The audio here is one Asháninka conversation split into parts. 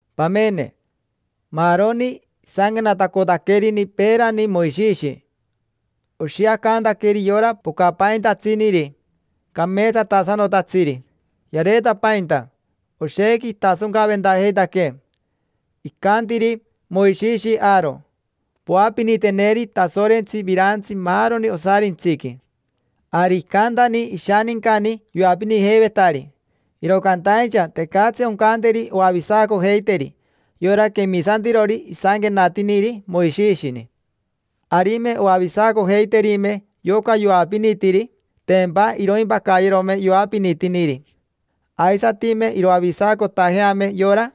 Pamene, maaroni isanquenatacotaquerini peerani Moishishi oshiacantaqueri yora pocapaintatsiniri, cameetsatasanotatsiri. Yareetapainta, oshequi itasoncaventajeitaquee. Icantiri Moishishi Aaro: “Poapiniteneri Tasorentsi virantsi maaroni osarintsiqui”. Ari icantani ishanincani yoapinijeivetari, iro cantaincha tecatsi oncanteri oavisacojeiteri yora quemisantirori isanquenatiniri Moishishini. Arime oavisacojeiterime yoca yoapinitiri, tempa iroimpacayerome yoapinitiniri. Aisatime iroavisacotajeame yora,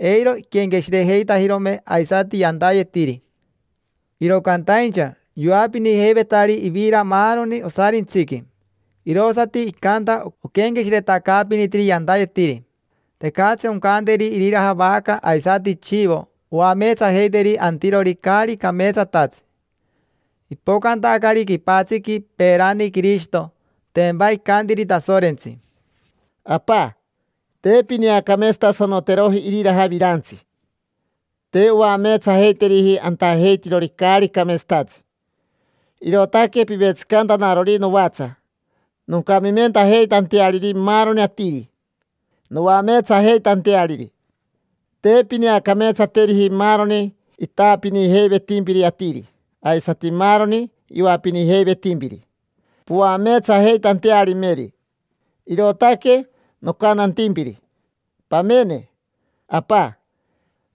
eiro iquenqueshirejeitajirome aisati yantayetiri. Iro cantaincha yoapinijeivetari ivira maaroni osarintsiqui, irosati icanta oquenqueshiretacaapinitiri yantayetiri. Tecatsi oncanteri iriraja vaca aisati chivo oameetsajeiteri antirori caari cameetsatatsi. Ipocantacari quipatsiqui peerani Quirishito, tempa icantiri Tasorentsi: “Apa, te pineacameetsatasanoteroji iriraja virantsi, te oameetsajeiteriji antajeitirori caari cameetsatatsi. Irootaque pivetsicantanarori novatsa noncamimentajeitanteariri maaroni atiri, noameetsajeitanteariri. Te pineacameetsateriji maaroni itaapinijeivetimpiri atiri, aisati maaroni yoapinijeivetimpiri poameetsajeitantearimeri. Irootaque nocantantimpiri: ‘Pamene, Apa,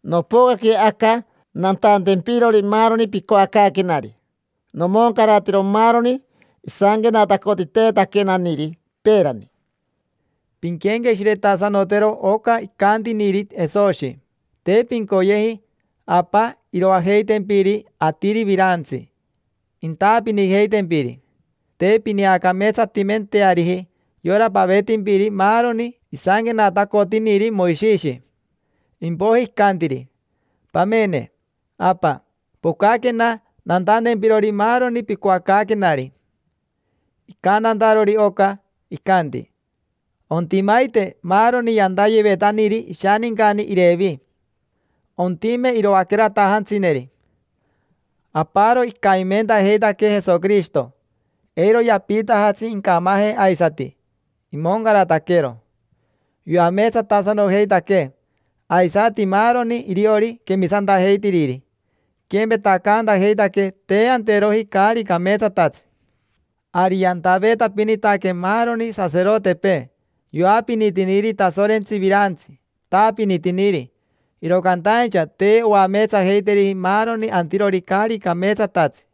nopocaque aca nantantempirori maaroni picoacaaquenari. Nomoncaratero maaroni isanquenatacotiteetaquenaniri peerani’”. Pinquenqueshiretasanotero oca icantiniri Jesoshi: “Te pincoyeji, Apa, iroajeitempiri atiri virantsi, intaapinijeitempiri. Te pineacameetsatimenteariji yora pavetimpiri maaroni isanquenatacotiniri Moishishi”. Impoiji icantiri: “Pamene, Apa, pocaquena nantantempirori maaroni picoacaaquenari”. Icantantarori oca, icanti: “Ontimaite maaroni yantayevetaniri ishanincani Irevi. Ontime iroaqueratajantsineri”. Aparo icamimentajeitaquee Jesoquirishito, eiro yapiitajatsi incamaje aisati, imoncarataquero. Yoameetsatasanojeitaquee, aisati maaroni iriori quemisantajeitiriri, iquempetacantajeitaquee te anteroji caari cameetsatatsi. Ari yantaveetapinitaque maaroni saserotepee, yoapinitiniri Tasorentsi virantsi, itaapinitiniri, iro cantaincha te oameetsajeiteriji maaroni antirori caari cameetsatatsi.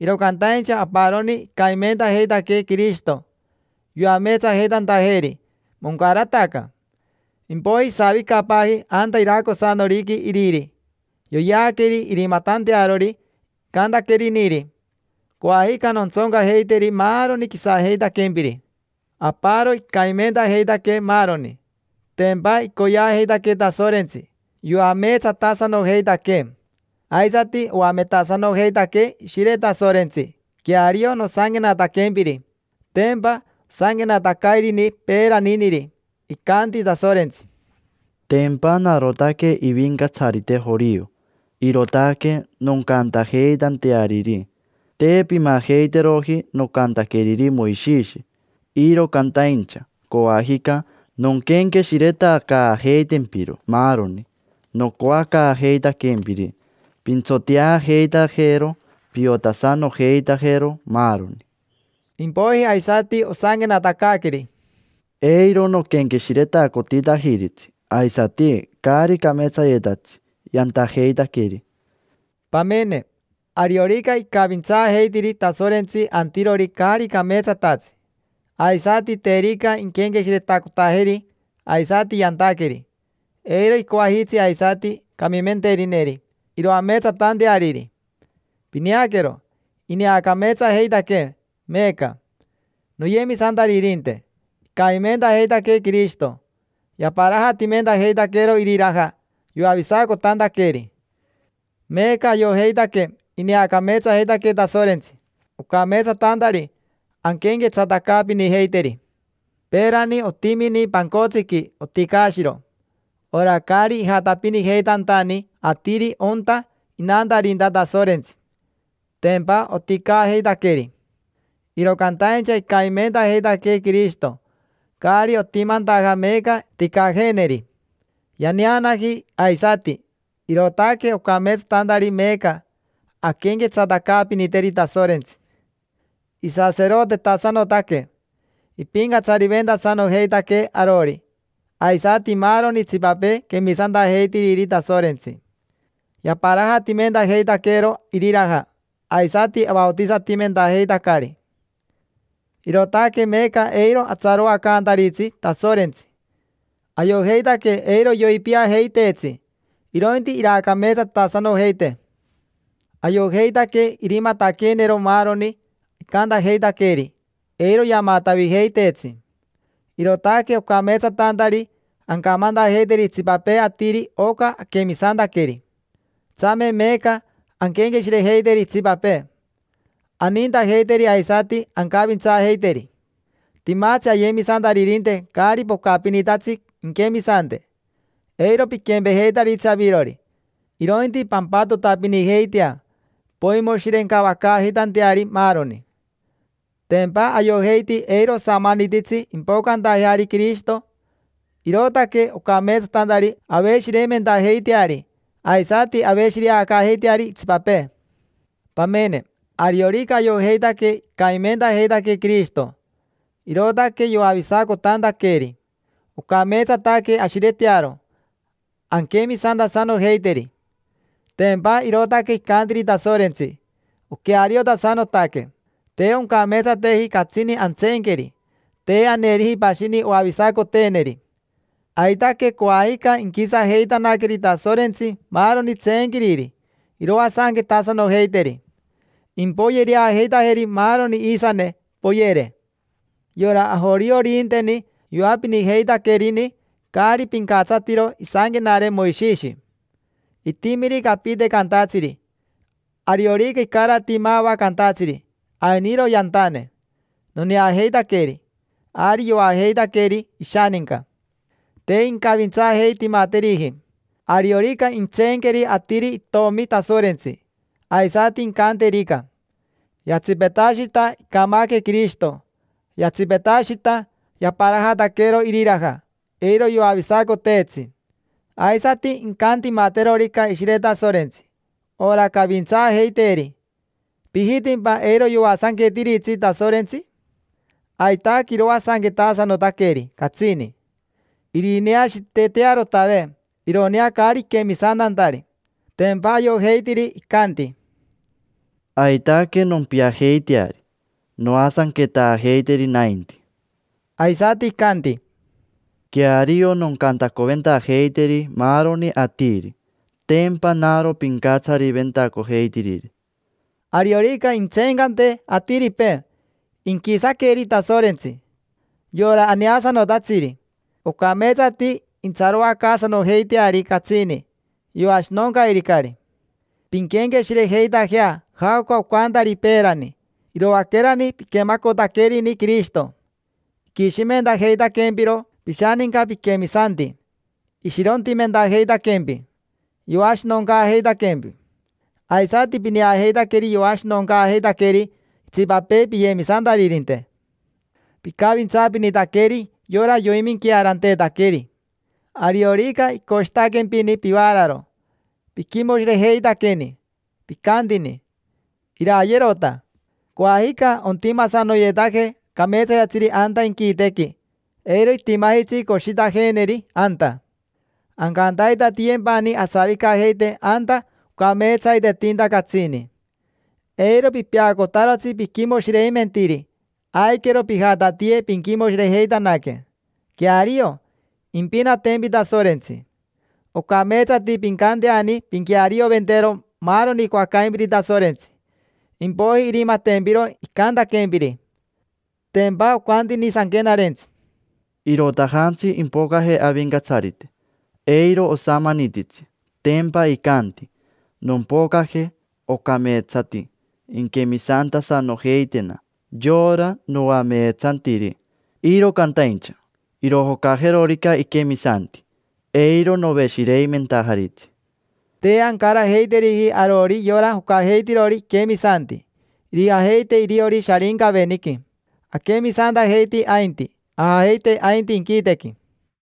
Iro cantaincha aparoni icamimentajeitaquee Quirishito, yoameetsajeitantajeeri, moncarataca. Impoiji isavicapaaji anta iracosanoriqui Iriri, yoyeaqueri irimatantearori icantaqueriniri: “Coajica nontsoncajeiteri maaroni quisajeitaquempiri”. Aparo icamimentajeitaquee maaroni: tempa icoyeajeitaquee Tasorentsi, yoameetsatasanojeitaquee. Aisati oametasanojeitaquee Ishire Tasorentsi queario nosanquenataquempiri; tempa osanquenatacairini peeraniniri: “Icanti Tasorentsi: ‘Tempa narotaque Ivincatsarite jorio, irootaque noncantajeitanteariri: Te pimajeiteroji nocantaqueriri Moishishi, iro cantaincha coajica nonquenqueshiretacaajeitempiro maaroni nocoacaajeitaquempiri, pintsoteajeitajero, piotasanojeitajero, maaroni’”. Impoiji aisati osanquenatacaaqueri: “Icanti Tasorentsi: ‘Eiro noquenqueshiretacotitajiritsi aisati caari cameetsayetatsi yantajeitaqueri’”. Pamene, ariorica icavintsaajeitiri Tasorentsi antirori caari cameetsatatsi, aisati terica inquenqueshiretacotajeri aisati yantaqueri, eiro icoajitsi aisati camimenterineri iroameetsatanteariri. Pineaquero, ineacameetsajeitaquee meeca. Noyemisantaririnte, icamimentajeitaquee Quirishito, yaparajatimentajeitaqueero iriraja yoavisacotantaqueeri. Meeca ayojeitaque ineacameetsajeitaquee Tasorentsi, ocameetsatantari anquenquetsatacaapinijeiteri. Peerani otimini pancotsiqui oticaashiro, ora caari ijatapinijeitantani atiri onta inantarinta Tasorentsi: tempa oticaajeitaqueri. Iro cantaincha icamimentajeitaquee Quirishito, caari otimantaja meeca ticaajeeneri. Yaneanaji aisati, irootaque ocameetsatantari meeca anquenquetsatacaapiniteri Tasorentsi. Isaserotetasanotaque, ipincatsariventasanojeitaquee arori, aisati maaroni itsipapee quemisantajeitiriri Tasorentsi. Yaparajatimentajeitaqueero iriraja, aisati avaotisatimentajeitacari. Irootaque meeca eiro atsaroacantaritsi Tasorentsi, ayojeitaque eiro yoipiajeiteetsi, irointi iraacameetsatasanojeitee. Ayojeitaque irimataqueenero maaroni icantajeitaqueeri, eiro yamatavijeiteetsi: irootaque ocameetsatantari ancamantajeiteri itsipapee atiri oca aquemisantaqueri. Tsame meeca anquenqueshirejeiteri itsipapee: anintajeiteri aisati ancavintsaajeiteri. Timatsi ayemisantaririnte caari pocapinitatsi inquemisante: eiro piquempejeitaritsi avirori, irointi pampatotapinijeitea poimoshirencavacaajeitanteari maaroni. Tempa ayojeiti eiro osamanititsi impocantajeari Quirishito, irootaque ocameetsatantari aveshireimentajeiteari aisati aveshireacaajeiteari itsipapee. Pamene, ariorica ayojeitaque icamimentajeitaquee Quirishito, irootaque yoavisacotantaqueeri, ocameetsataque ashiretearo, anquemisantasanojeiteri: tempa irootaque icantiriri Tasorentsi, oqueariotasanotaque. Te oncameetsateji catsini antseenqueri, te aneriji pashini oavisacoteeneri. Aitaque coajica inquisajeitanaqueri Tasorentsi maaroni tseenquiriri, iroasanquetasanojeiteri. Impoyereajeitajeri maaroni iisane, poyere. Yora ajorioririnteni yoapinijeitaquerini caari pincatsatiro isanquenare Moishishi. Itimirica apite cantatsiri, ariorica icarati mava cantatsiri: “Ainiro yantane, noneajeitaqueri”, ari yoajeitaqueri ishaninca. Te incavintsaajeitimateriji. Ariorica intseenqueri atiri Itomi Tasorentsi, aisati incanterica: “Yatsipetashita icamaque Quirishito, yatsipetashita yaparajataquero iriraja, eiro yoavisacoteetsi”; aisati incantimaterorica Ishire Tasorentsi, ora cavintsaajeiteeri: ¿pijitimpa eiro yoasanquetiritsi Tasorentsi? Aitaque iroasanquetasanotaqueri, catsini: irineashiitetearotave, ironea caari iquemisantantari. Tempa ayojeitiri, ayojeiti icanti: “Aitaque nompiajeiteari, noasanquetaajeiteri nainti”. Aisati icanti: “Queario noncantacoventajeiteri maaroni atiri, tempa naro pincatsariventacojeitiriri”. Ariorica intsencante atiripee, inquisaqueri Tasorentsi, yora aneasanotatsiri: ocameetsati intsaroacaasanojeiteari catsini, yoashinoncairicari. Pinquenqueshirejeitajea jaoca ocantari peerani, iroaquerani piquemacotaquerini Quirishito. Iquishimentajeitaquempiro pishaninca piquemisanti, ishirontimentajeitaquempi, yoashinoncaajeitaquempi. Aisati pineajeitaqueri yoashinoncaajeitaqueri itsipapee piyemisantaririnte. Picavintsaapinitaqueri yora yoiminquearanteetaqueri. Ariorica icoshitaquempini pivaararo, piquimoshirejeitaqueni, picantini: “Irayerota. Coajica ontimasanoyetaje cameetsayetatsiri anta inquitequi, eiro itimajitsi coshitajeeneri anta. Ancantaitatiyempani asavicajeite anta ocameetsaitetinta catsini”. Eiro pipeacotarotsi piquimoshireimentiri, aiquero pijatatiye pinquimoshirejeitanaque. Queario, impinatempi Tasorentsi. Ocameetsati pincanteani pinquearioventero maaroni icoacaimpiri Tasorentsi, impoiji irimatempiro icantaquempiri. Tempa ocantini sanquenarentsi: “Irotajantsi ipocaje Avincatsarite, eiro osamanititsi, tempa icanti: ‘Nompocaje. Ocameetsati inquemisantasanojeitena yora noameetsantiri. Iro cantaincha irojocajerorica iquemisanti, eiro noveshireimentajaritsi’”. Te ancarajeiteriji arori yora jocajeitirori iquemisanti: irijajeite iriori Sharincaveniqui. Aquemisantajeiti ainti, ajajeite ainti inquitequi.